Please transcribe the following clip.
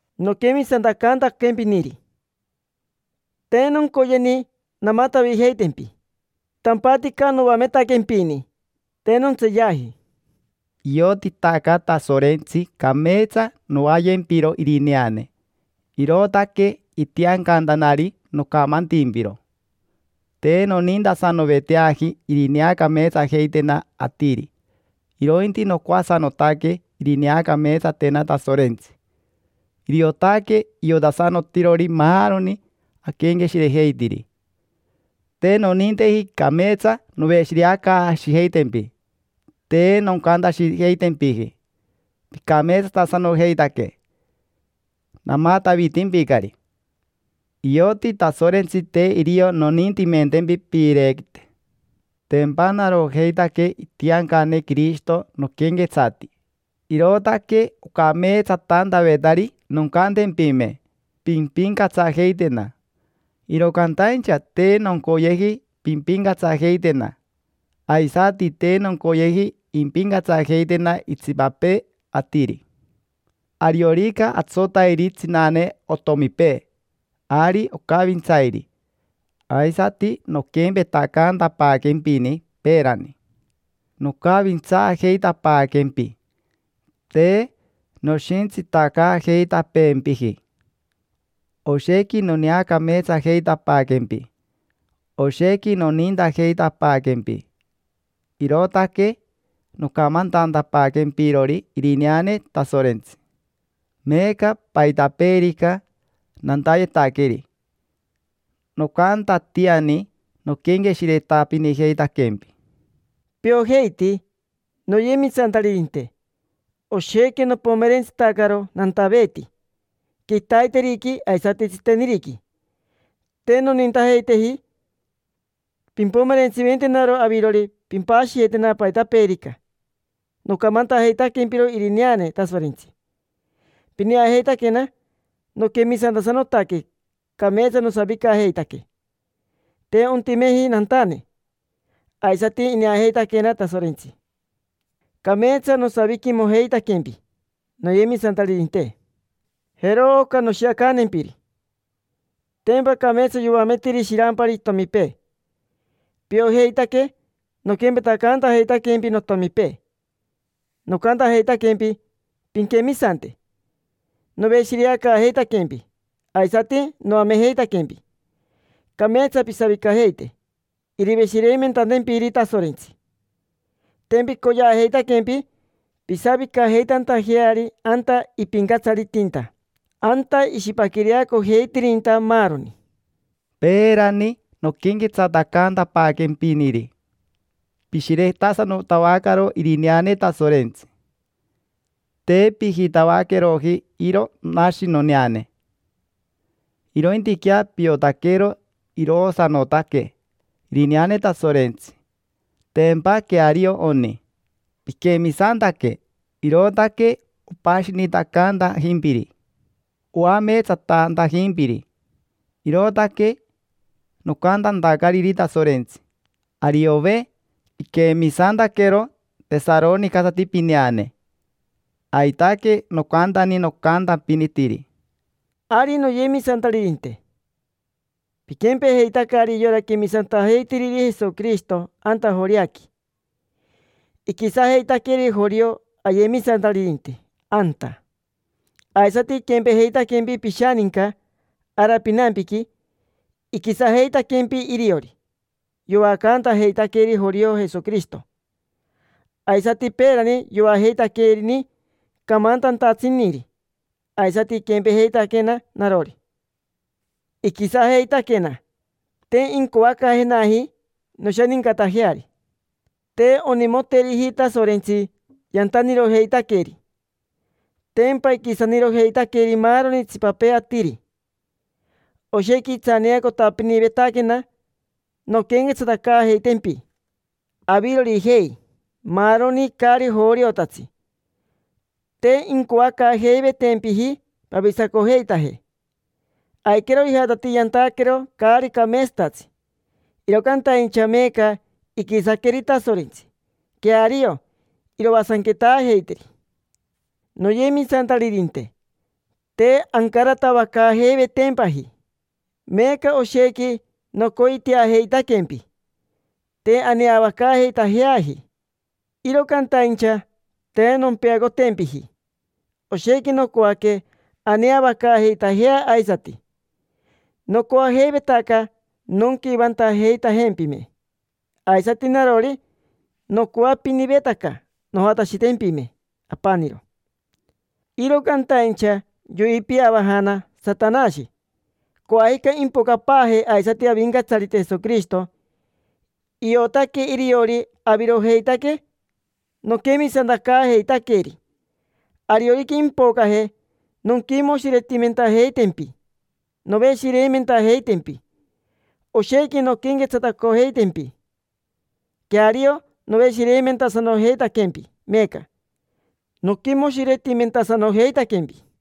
Noquemisantacantaquempiniri, te noncoyeni namatavijeitempi. Tampatica noametaquempini: te nontseeyaji. Iotitaca Tasorentsi cameetsa novaayempiro irineane, irootaque itiancantanari nocamantimpiro. Te nonintasanoveteaji irineacameetsajeitena atiri, irointi nocoasanotaque irineacameetsatena Tasorentsi. Iriotaque iotasanotirori maaroni aquenqueshirejeitiri. Te noninteji cameetsa noveshireacaashijeitempi, te noncantashijeitempiji: “Picameetsatasanojeitaque”. Namatavitimpicari. Ioti Tasorentsi te irio nonintimentempi piirequite. Tempa narojeitaque itiancane Quirishito noquenquetsati, irootaque ocameetsatantavetari noncantempime: “Pimpincatsajeitena”. Iro cantaincha te noncoyeji pimpincatsajeitena, aisati te noncoyeji impincatsajeitena itsipapee atiri. Ariorica atsotairi tsinane otomipee, ari ocavintsairi. Aisati noquempetacantapaaquempini peerani: nocavintsaajeitapaaquempi, te noshintsitacaajeitapeempiji. Oshequi noneacameetsajeitapaaquempi, oshequi nonintajeitapaaquempi, irootaque nocamantantapaaquempirori irineane Tasorentsi. Meeca, paitapeerica nantayetaqueri, nocantatiani noquenqueshiretapinijeitaquempi. Piojeiti, noyemisantaririnte, oshequi nopomerentsitacaro nantaveeti quitaiteriqui aisati tsiteniriqui. Te nonintajeiteji pimpomerentsiventenaro avirori pimpashiyetena paitapeerica. Nocamantajeitaquempiro Irineane Tasorentsi. Pineajeitaquena noquemisantasanotaque, cameetsa nosavicajeitaque, te ontimeji nantane. Aisati ineajeitaquena Tasorentsi, cameetsa nosaviquimojeitaquempi, noyemisantaririnte. Jero oca noshiacantempiri: tempa cameetsa yoametiri shirampari itomipee. Piojeitaque noquempetacantajeitaquempi notomipee, nocantajeitaquempi pinquemisante, noveshireacaajeitaquempi, aisati noamejeitaquempi cameetsa pisavicajeite iriveshireimentantempiri Tasorentsi. Tempa icoyeajeitaquempi pisavicajeitantajeari anta ipincatsaritinta, anta ishipaquireacojeitirinta maaroni. Peerani, noquenquetsatacantapaaquempiniri, pishiretasanotavacaro Irineane Tasorentsi. Te pijitavaqueroji iro nashi noneane, irointiquea piotaquero iroosanotaque irineane Tasorentsi, tempa queario oni. Piquemisantaque, irootaque opashinitacantajimpiri, oameetsatantajimpiri. Irootaque nocantantacariri Tasorentsi: “Ariove, iquemisantaquero tesaronicasati pineane”. Aitaque nocantani nocantapinitiri. Ari, noyemisantaririnte, piquempejeitacari yora quemisantajeitiriri Jesoquirishito anta Joreaqui. Iquisajeitaqueri jorio ayemisantaririnte anta, aisati iquempejeitaquempi pishaninca ara pinampiqui, iquisajeitaquempi iriori. Yoacantajeitaqueri jorio Jesoquirishito, aisati peerani yoajeitaquerini camantantatsiniri. Aisati iquempejeitaquena narori: iquisajeitaquena, te incoacaajenaji noshanincatajeari. Te onimoteriji Tasorentsi yantanirojeitaqueri: tempa iquisanirojeitaqueri maaroni itsipapee atiri. Oshequi itsaneacotapinivetaquena nonquenquetsatacaajeitempi avirorijei, maaroni caari joriotatsi. Te incoacaajeivetempiji pavisacojeitaje. Aiquero ijatatii yantaquero caari cameetsatatsi, iro cantaincha meeca iquisaqueri Tasorentsi, queario iroasanquetaajeiteri. Noyemisantaririnte, te ancaratavacaajeivetempaji, meeca oshequi nocoiteajeitaquempi. Te aneavacaajeitajeaji, iro cantaincha te nompeacotempiji. Oshequi nocoaque aneavacaajeitajea aisati. Nocoajeivetaca nonquivantajeitajempime. Aisati narori nocoapinivetaca nojatashitempime apaniro, iro cantaincha yoipiavajana Satanashi. Coajica impocapaaje aisati Avincatsarite Jesoquirishito. Iotaque iriori avirojeitaque noquemisantacaajeitaqueri. Ariorica impocaje, nonquimoshiretimentajeitempi, noveshireimentajeitempi, oshequi nonquenquetsatacojeitempi. Queario, noveshireimentasanojeitaquempi meeca, noquimoshiretimentasanojeitaquempi.